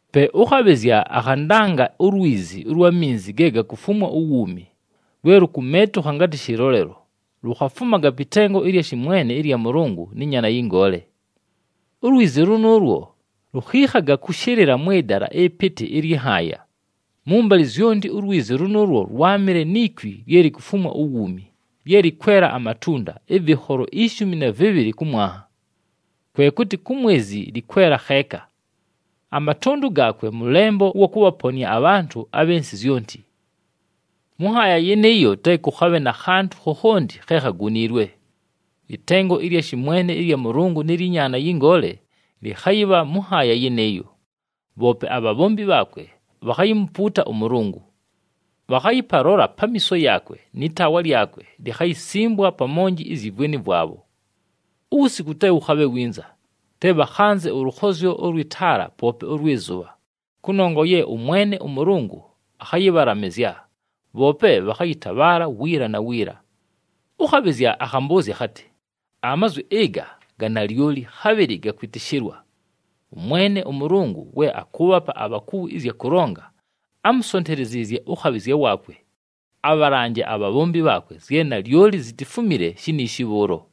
Pe ʉkhabhɨzya akhandanga ulwizi ʉlwa minzi ge gakufumwa uwuumi, lwe lukumeetukha ngatɨ shɨlolelo, lukhafumaga pɨ tengo ɨlya shɨmwene ɨlya Mʉlʉngʉ nɨ Nyaana yɨ Ngoole. Ulwizi lʉnʉʉlwo lukhiikhaga kʉshɨlɨla mwɨ dala ɨpɨtɨ ɨlyɨ nhaaya. Mʉmbalɨ zyonti ulwizi lʉnʉʉlwo lwámɨle ni kwi lye likufumwa uwuumi, lye lɨkwela amatunda, ɨvɨkholo ishumi na vɨbhɨlɨ kʉ mwanha. Kwe kʉtɨ ku mwezi lɨkwela kheeka. Amatʉndʉ gaakwe mʉlembo ʉwa kʉbhaponɨa abhantʉ abhɨ nsɨ zyonti. Mʉ nhaaya yɨnɨɨyo te kʉkhabhe na khantʉ khokhonti khe khaguniilwe. Ɨtengo ɨlya shɨmwene ɨlya Mʉlʉngʉ nɨ lyɨ Nyaana yɨ Ngoole lɨkhayɨbha mʉ nhaaya yɨnɨɨyo. Bhoope abhabhombi bhaakwe bhakhayimupuuta ʉMʉlʉngʉ. Bhakhayɨpalola pamiiso yaakwe nɨ taawa lyakwe likhayisimbwa pa monji izyi vweni vwabho. Uwusiku te wʉkhabhe winza, te bhakhanze ʉlʉkhozyo ʉlwɨ taala poope ʉlwɨ zʉbha, kʉnongwa ye ʉMwene ʉMʉlʉngʉ akhayɨbhalamɨzya, bhoope bhakhayɨtabhaala wiila na wiila. Ʉkhabhɨzya akhambʉʉzya akhatɨ, “Amazwi ɨga ga nalyoli, khabhɨlɨ ga kwɨtɨshɨlwa. ɄMwene ʉMʉlʉngʉ we akʉʉbhapa abhakuwi ɨzya kʉlonga, ámusonteleziizye ʉkhabhɨzya waakwe abhalanje abhabhombi bhaakwe zye nalyoli zitifumile shiniishi bhʉʉlo.”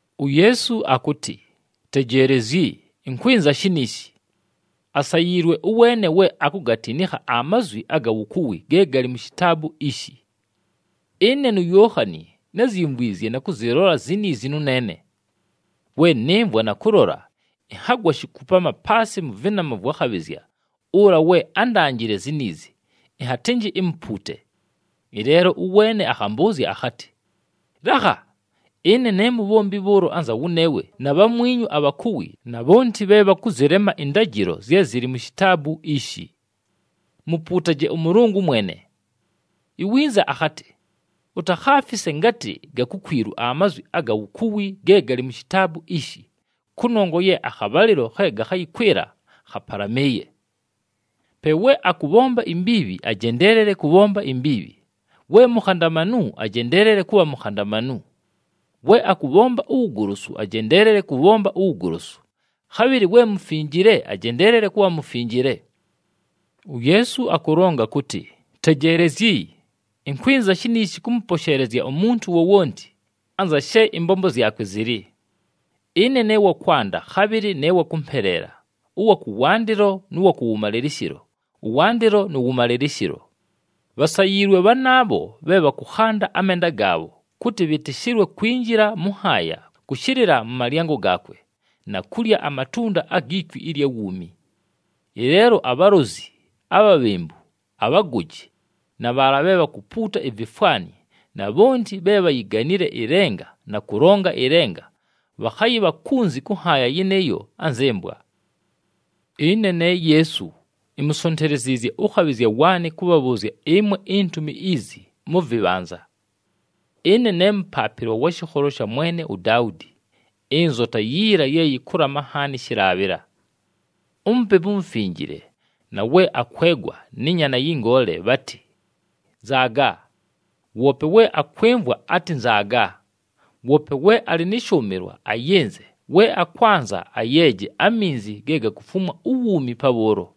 UYeesu akʉtɨ, “Tejeelezyi! Ɨnkwɨnza shiniishi. Asayiilwe ʉweene we akugatinikha amazwi aga wukuwi ge galɨ mu shitaabu ishi.” Ɨne nuYookhani, názyimvwizye na kʉzɨlola ziniizi nʉneene. We nɨmvwa na kʉlola, ɨnhagwa shikupama paasɨ mʉ vɨnama vwa khabhɨzya ʉla we ándanjile ziniizi, ɨnhatɨnjɨ imupuute. Ɨleelo ʉweene akhambʉʉzya akhatɨ, “Lakha! Ɨne ne mubhombi bhʉʉlo anza wʉneewe na bhamwinyu abhakuwi na bhonti bhe bhakʉzɨlema ɨndajɨlo zye zɨlɨ mu shitaabu ishi. Mupuutaje ʉMʉlʉngʉ mwene!” Iwinza akhatɨ, “Utakhaafise ngatɨ ga kukwilu amazwi aga wukuwi ge galɨ mu shitaabu ishi, kʉnongwa ye akhabhalɨlo khe gakhayɨkwɨla khapalamɨɨye. Pe we akʉbhomba imbiibhi ajendeelele kʉbhomba imbiibhi, we mukhandamanu ajendeelele kʉbha mukhandamanu. We akʉbhomba uwugolosu, ajendeelele kʉbhomba uwugolosu, khabhɨlɨ we mufinjile ajendeelele kʉbha mufinjile.” UYeesu akʉlonga kʉtɨ, “Tejeelezyi! Ɨnkwɨnza shiniishi kʉmʉposheelezya umuntu wowonti anza she ɨmbombo zyakwe zɨlɨ. Ɨne ne wa kwanda, khabhɨlɨ ne wa kʉmpeleela, ʉwa kʉwandɨlo nʉ wa kʉwʉmalɨlɨshɨlo, ʉwandɨlo nʉ wʉmalɨlɨshɨlo.” Bhasayiilwe bhanaabho bhe bhakʉkhanda amenda gaabho, kʉtɨ bhɨtɨshɨlwe kwinjila mʉ nhaaya kʉshɨlɨla mʉ malyango gaakwe, na kulya amatunda agi kwi ɨlya wuumi. Ɨleelo abhalozi, abhabhembu, abhagoji, na bhaala bhe bhakupuuta ivifwani na bhonti bhe bhayiganile ɨlenga na kʉlonga ɨlenga bhakhayɨbha kunzi kʉ nhaaya yɨnɨɨyo anzɨ mbwa. “Ɨne ne Yeesu, imusonteleziizye ʉkhabhɨzya waanɨ kʉbhabhʉʉzya ɨmwe intumi izi mʉ vɨbhanza. Ɨne ne mʉpaapɨlwa wa shɨkholo sha mwene uDaudi, ɨnzota yiila ye yɨkʉlama nhaani shɨlaabhɨla.” UMupepu uMufinjile na we akwegwa nɨ Nyaana yɨ Ngoole bhatɨ, “Nzaaga!” Woope we akwɨmvwa atɨ, “Nzaaga!” Woope we alɨ nɨ shʉʉmɨlwa ayɨnze, we akwanza, ayeeje aminzi ge gakufumwa uwuumi pabhʉʉlo.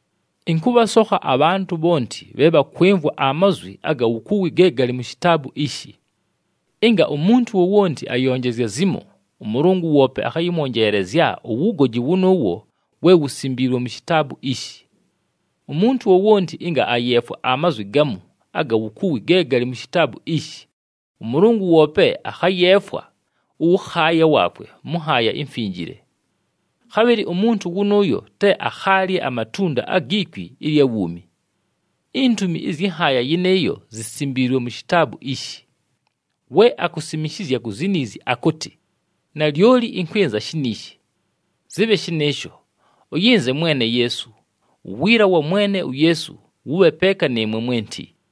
Ɨnkʉbhasokha abhantʉ bhonti bhe bhakwɨmvwa amazwi aga wukuwi ge galɨ mu shitaabu ishi. Ɨnga umuntu wowonti ayonjezya zimo, ʉMʉlʉngʉ woope akhayɨmwonjeelezya uwugoji wʉnʉʉwo we wusimbiilwe mu shitaabu ishi. Umuntu wowonti ɨnga ayeefwa amazwi gamu aga wukuwi ge galɨ mu shitaabu ishi, ʉMʉlʉngʉ woope akhayeefwa ʉwʉkhaaya waakwe mʉ nhaaya imfinjile. Khabhɨlɨ umuntu wʉnʉʉyo te akhaalye amatunda agi kwi ɨlya wuumi. Intumi ɨzyɨ nhaaya yɨnɨɨyo zisimbiilwe mu shitaabu ishi. We akusimishizya ku ziniizi akʉtɨ, “Nalyoli ɨnkwɨnza shiniishi.” Zɨbhe shɨnɨɨsho. Ʉyɨnze Mwene Yeesu! Uwiila wa Mwene uYeesu, wʉbhe peeka nɨɨmwe mwenti.